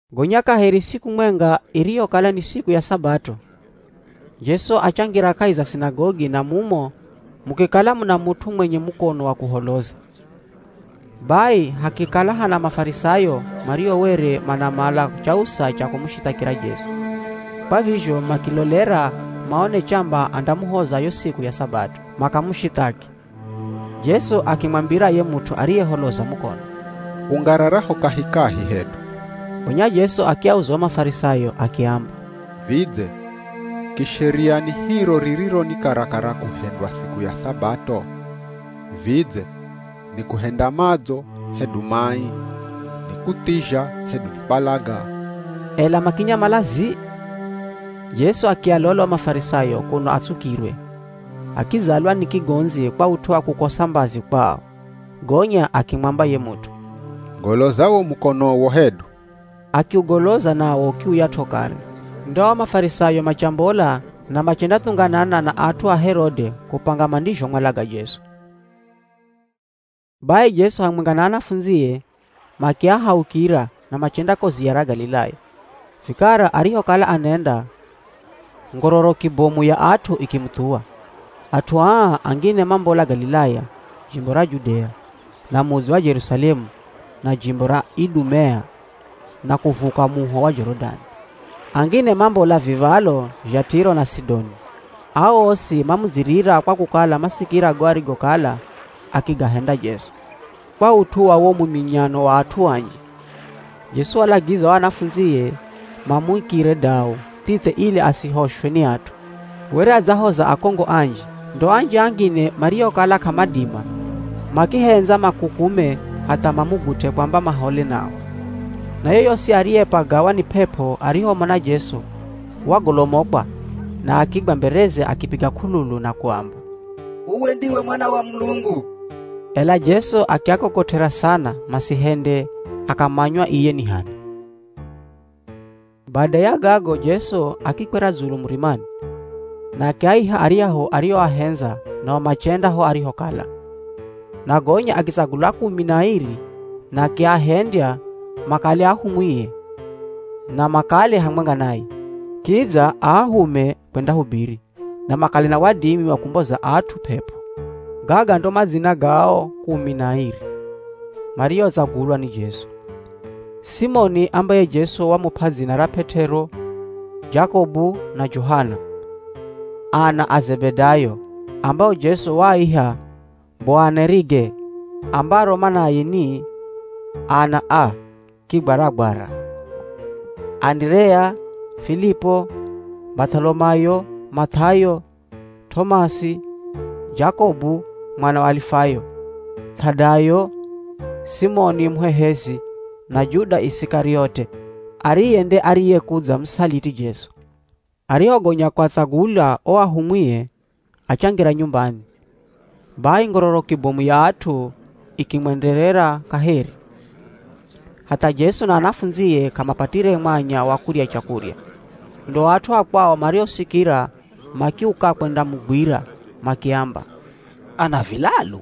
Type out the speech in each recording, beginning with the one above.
Gonya kaheri siku mwenga iriyokala ni siku ya Sabato, Jesu achangira kahi za sinagogi na mumo mukikala muna mut'u mwenye mukono wa kuholoza. Bai hakikala hana Mafarisayo mario were manamala chausa cha kumushithakira Jesu, kwa vizho makilolera maone chamba andamuhoza yo siku ya Sabato, makamushithaki. Jesu akimwambira ye mut'u ariyeholoza mukono, “Ungarara ho kahikahi hedu.” Gonya Jesu akiauza o Mafarisayo akiamba, “Vidze kisheria ni hiro ririro ni karakara kuhendwa siku ya Sabato? Vidze ni kuhenda madzo hedu mai? Ni kuthizha hedu ni kwalaga?” Ela makinyamala zii! Jesu akialola o Mafarisayo kuno atsukirwe, akidzalwa ni kigondzi kwa ut'u wa kukosa mbazi kwao. Gonya akimwamba ye mut'u, “Goloza wo mukonowo hedu.” Akiugoloza nawo ukiuyat'o kare. Ndo ao Mafarisayo machambola na machendathunganana na at'u a Herode kupanga mandizhomwalaga Jesu. Bai Jesu hamwenga na anafundzie makiahaukira na machenda ko ziya ra Galilaya. Vikara arihokala anenda, ngororoki bomu ya at'u ikimuthuwa. At'u aa, angine mambola Galilaya, jimbo ra Judea, na mudzi wa Jerusalemu, na jimbo ra Idumea, na kuvuka muho wa Jorodani. Angine mambola viv̱alo zha Tiro na Sidoni. Ao osi mamudzirira kwa kukala masikira go arigokala akigahenda Jesu. Kwa ut'u wa wo muminyano wa o at'u anji, Jesu walagiza o anafundzie mamuikire dau thithe ili asihoshwe ni at'u. Were adzahoza akongo anji, ndo anji angine mariokala k'amadima, makihendza makukume hatha mamugut'e kwamba mahole nao. Na yoyosi ariyepagawa ni p'ep'o arihomona Jesu, wagolomokwa na akigwa mbereze akipiga k'ululu na kuamba, “Uwe ndiwe Mwana wa Mulungu.” Ela Jesu akiakokot'era sana masihende akamanywa iye ni h'ani. Bada ya gago Jesu akikwera dzulu murimani, na akiaiha aryahu arioahendza nao machenda ho arihokala. Na gonya akitsagula kumi na airi na akiahendya makale ahumwie na makale hamwenga naye. Kidza aahume kwendahubiri, na makale na wadimi wa kumboza at'u p'ep'o. Gaga ndo madzina ga o kumi na airi mariotsagulwa ni Jesu: Simoni ambaye Jesu wamup'a dzina ra P'et'ero, Jakobu na Johana, ana a Zebedayo ambao Jesu waaiha Boanerige, ambaro manaye ni “Ana a kigwaragwara,” Anderea, Filipu, Bath'olomayo, Math'ayo, T'omasi, Jakobu mwana wa Alifayo, Th'adayo, Simoni Muhehezi, na Juda Isikariote ariye nde ariyekudzamusaliti Jesu. Arihogonya kuatsagula o ahumwie, achangira nyumbani. Bai ngororoki bomu ya at'u ikimwenderera kaheri, hatha Jesu na anafundzie k'amapatire mwanya wa kurya chakurya. Ndo at'u a kwao marihosikira makiuka kwendamugwira, makiamba, “Ana vilalu.”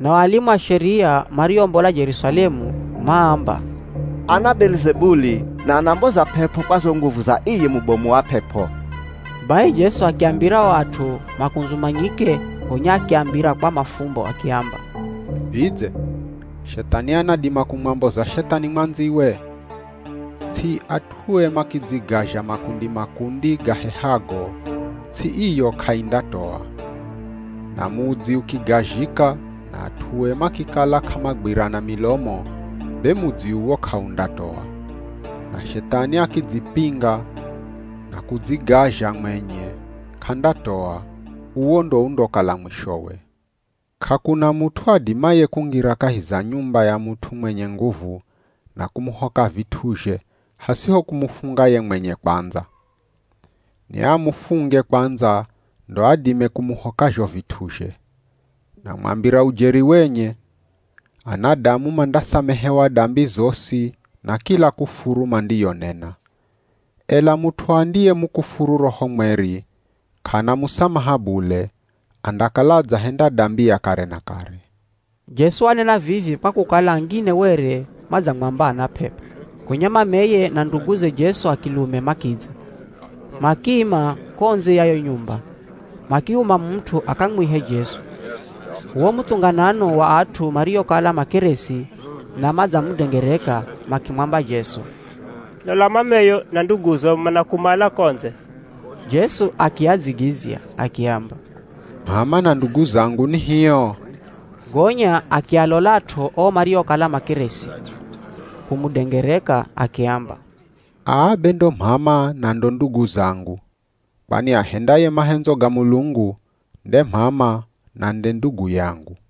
Nao alimu a Sheria mariombola Jerusalemu maamba, “Ana Belizebuli na anamboza p'ep'o kwa zo nguvu za iye mubomu wa p'ep'o.” Bai Jesu akiambira o at'u makundzumanyike, gonya akiambira kwa mafumbo akiamba, “Vidze Shethani anadima kumwamboza Shethani mwandziwe? Ts'i at'ue makidzigazha makundi-makundi gahehago, ts'i iyo k'aindatoa. Na mudzi ukigazhika na at'ue makikala k'amagwirana milomo, be mudzi uwo k'aundatoa. Na Shethani akidzipinga na kudzigazha mwenye, k'andatoa, uwo ndo undokala mwishowe. K'akuna mut'u adimaye kungira kahi za nyumba ya mut'u mwenye nguvu na kumuhoka vit'uzhe hasiho kumufunga ye mwenye kwandza. Niamufunge kwandza ndo adime kumuhoka zho vit'uzhe. Namwambira ujeri wenye, anadamu mandasamehewa dambi zosi na kila kufuru mandiyonena. Ela mut'u andiyemukufuru Roho Mweri, k'ana musamaha bule, andakala adzahenda dambi ya kare na kare.” Jesu wanena vivi kwa kukala angine were madzamwamba ana p'ep'o. Gonya mameye na nduguze Jesu a kilume makidza. Makiima ko ndze ya yo nyumba, makihuma mut'u akamwihe Jesu. Wo muthunganano wa at'u mariokala makeresi, na madzamudengereka makimwamba Jesu, “Lola mameyo na nduguzo manakumala ko ndze.” Jesu akiadzigidzya akiamba, “M'ama na ndugu zangu ni hio?” Gonya akialolat'o o mariokala makeresi, kumudengereka, akiamba, “Aa be ndo m'ama na ndo ndugu zangu! Kwani ahendaye mahendzo ga Mulungu, nde m'ama na nde ndugu yangu.”